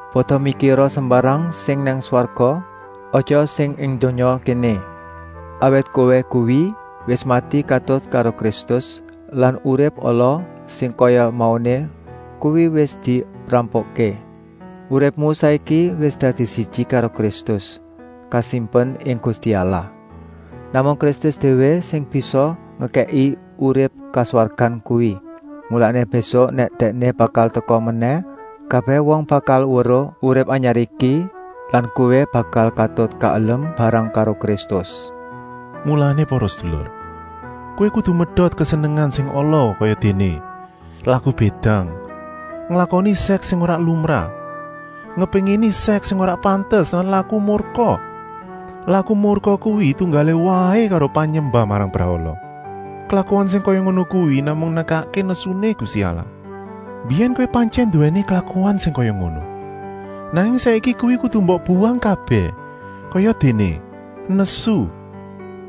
Pada mikira sembarang sing nang swarga, aja sing ing donya kéné. Awit kowé kuwi wis mati katut karo Kristus lan urip ala sing kaya mauné kuwi wis dirampungké. Uripmu saiki iki wis dadi siji karo Kristus, kasimpen ing Gusti Allah. Namung Kristus déwé sing bisa ngekèki urip kaswargan kuwi. Mulané, mbésuk nèk Dèkné bakal teka menèh, kabèh wong bakal weruh urip anyar iki lan kowé bakal katut kaelem bareng karo Kristus. Mulané para sedulur, kowé kudu medot kesenengan sing ala kayadéné: laku bédang, nglakoni sèks sing ora lumrah, ngepéngini sèks sing ora pantes lan laku murka. Laku murka kuwi tunggalé waé karo panyembah marang brahala. Klakuan sing kaya ngono kuwi namung nekakké nesuné Gusti Allah. Mbiyèn kowé pantyèn nduwèni klakuan sing kaya ngono, nanging saiki kuwi kudu mbok buwang kabèh, kayadéné: nesu,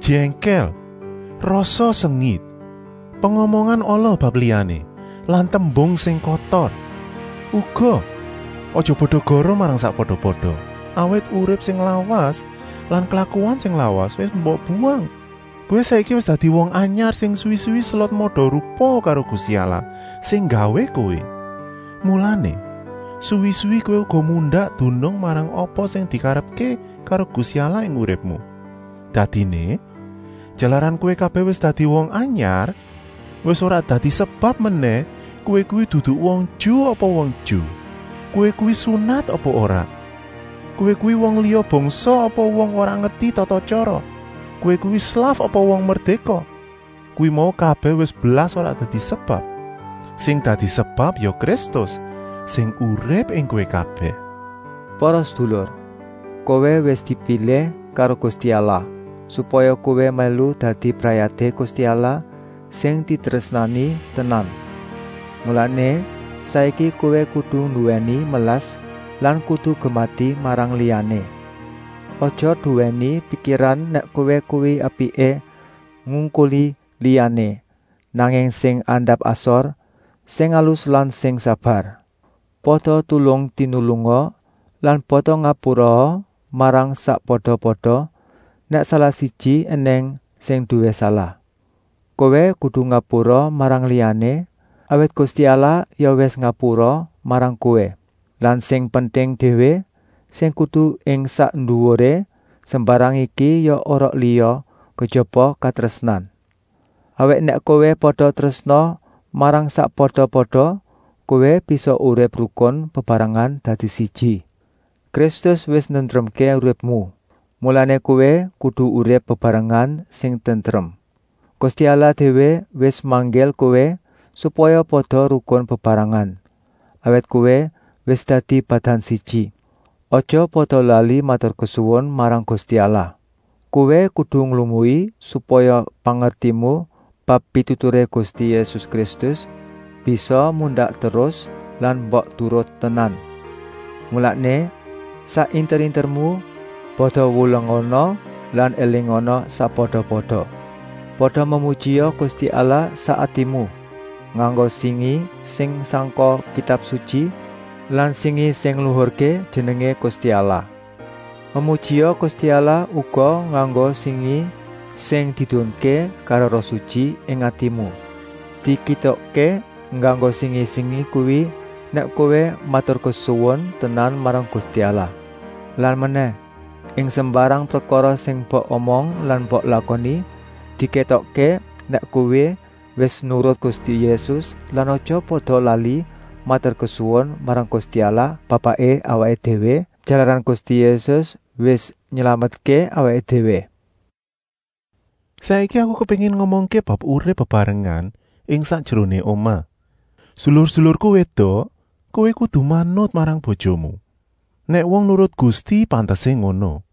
jèngkèl, rasa sengit, pengomongan ala bab liyané lan tembung sing kotor. Uga, aja pada goroh marang sakpada-pada, awit urip sing lawas lan klakuan sing lawas wis mbok buwang. Kowé saiki wis dadi wong anyar sing suwi-suwi selot mada-rupa karo Gusti Allah sing nggawé kowé. Mulané, suwi-suwi kowé uga mundak dunung marang apa sing dikarepké karo Gusti Allah ing uripmu. Dadiné, jalaran kowé kabèh wis dadi wong anyar, wis ora dadi sebab menèh kowé kuwi dudu wong Ju apa wong Ju, kowé kuwi sunat apa ora, kowé kuwi wong liya bangsa apa wong ora ngerti tata-tyara, kowé kuwi slaf apa wong merdéka. Kuwi mau kabèh wis blas ora dadi sebab. Sing dadi sebab ya Kristus, sing urip ing kowé kabèh. Para sedulur, kowé wis dipilih karo Gusti Allah, supaya kowé mèlu dadi brayaté Gusti Allah sing ditrésnani tenan. Mulané, saiki kowé kudu nduwèni melas lan kudu gemati marang liyané. Aja nduwèni pikiran nèk kowé kuwi apiké ngungkuli liyané, nanging sing andap-asor, sing alus lan sing sabar. Pada tulung-tinulunga lan pada ngapuraa marang sakpada-pada, nèk salah-siji ènèng sing nduwé salah. Kowé kudu ngapura marang liyané, awit Gusti Allah ya wis ngapura marang kowé. Lan sing penting déwé, sing kudu ing sak nduwuré sembarang iki ya ora liya kejaba katrésnan. Awit nèk kowé pada trésna marang sakpada-pada, kowé bisa urip rukun bebarengan dadi siji. Kristus wis nentremké uripmu, mulané kowé kudu urip bebarengan sing tentrem. Gusti Allah déwé wis manggil kowé supaya pada rukun bebarengan, awit kowé wis dadi badan siji. Aja pada lali maturkesuwun marang Gusti Allah. Kowé kudu nglumui supaya pangertimu bab pituturé Gusti Yésus Kristus bisa mundak terus lan mbok turut tenan. Mulané, sak inter-intermu pada wulangana lan élingana sakpada-pada. Pada memujia Gusti Allah sak atimu, nganggo singi sing sangka Kitab Sutyi lan singi sing ngluhurké jenengé Gusti Allah. Memujia Gusti Allah uga nganggo singi sing diedunké karo Roh Sutyi ing atimu. Dikétokké nganggo singi-singi kuwi nèk kowé maturkesuwun tenan marang Gusti Allah. Lan menèh, ing sembarang prekara sing mbok omong lan mbok lakoni, dikétokké nèk kowé wis nurut Gusti Yésus lan aja pada lali maturkesuwun marang Gusti Allah Bapaké awaké déwé, jalaran Gusti Yésus wis nylametké awaké déwé. Saiki aku kepéngin ngomongké bab urip bebarengan ing sakjeroné omah. Sedulur-sedulurku wédok, kowé kudu manut marang bojomu. Nèk wong nurut Gusti pantesé ngono.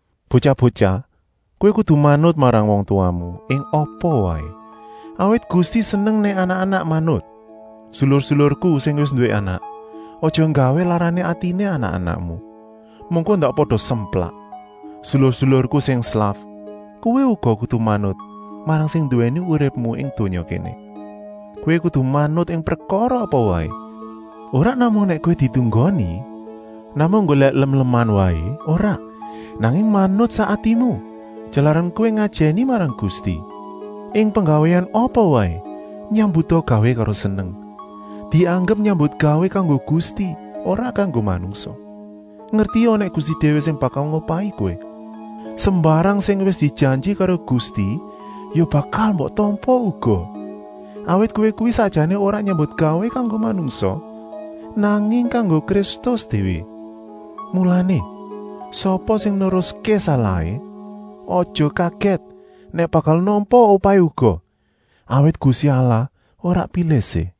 Botyah-botyah, kowé kudu manut marang wong tuwamu ing apa waé, awit Gusti seneng nèk anak-anak manut. Sedulur-sedulurku sing wis nduwé anak, aja nggawé larané atiné anak-anakmu. Mengko ndak pada semplak. Sedulur-sedulurku sing slaf, kowé uga kudu manut marang sing nduwèni uripmu ing donya kéné. Kowé kudu manut ing prekara apa waé, ora namung nèk kowé ditunggoni, namung nggolèk lem-leman waé, ora, nanging manut sak atimu, jalaran kowé ngajèni marang Gusti. Ing penggawéan apa waé, nyambuta gawé karo seneng, dianggep nyambutgawé kanggo Gusti, ora kanggo manungsa. Ngertia nèk Gusti déwé sing bakal ngupahi kowé. Sembarang sing wis dijanji karo Gusti ya bakal mbok tampa uga. Awit kowé kuwi sakjané ora nyambutgawé kanggo manungsa, nanging kanggo Kristus déwé. Mulané, sapa sing neruské salahé, aja kagèt nèk bakal nampa upahé uga, awit Gusti Allah ora pilih-sih.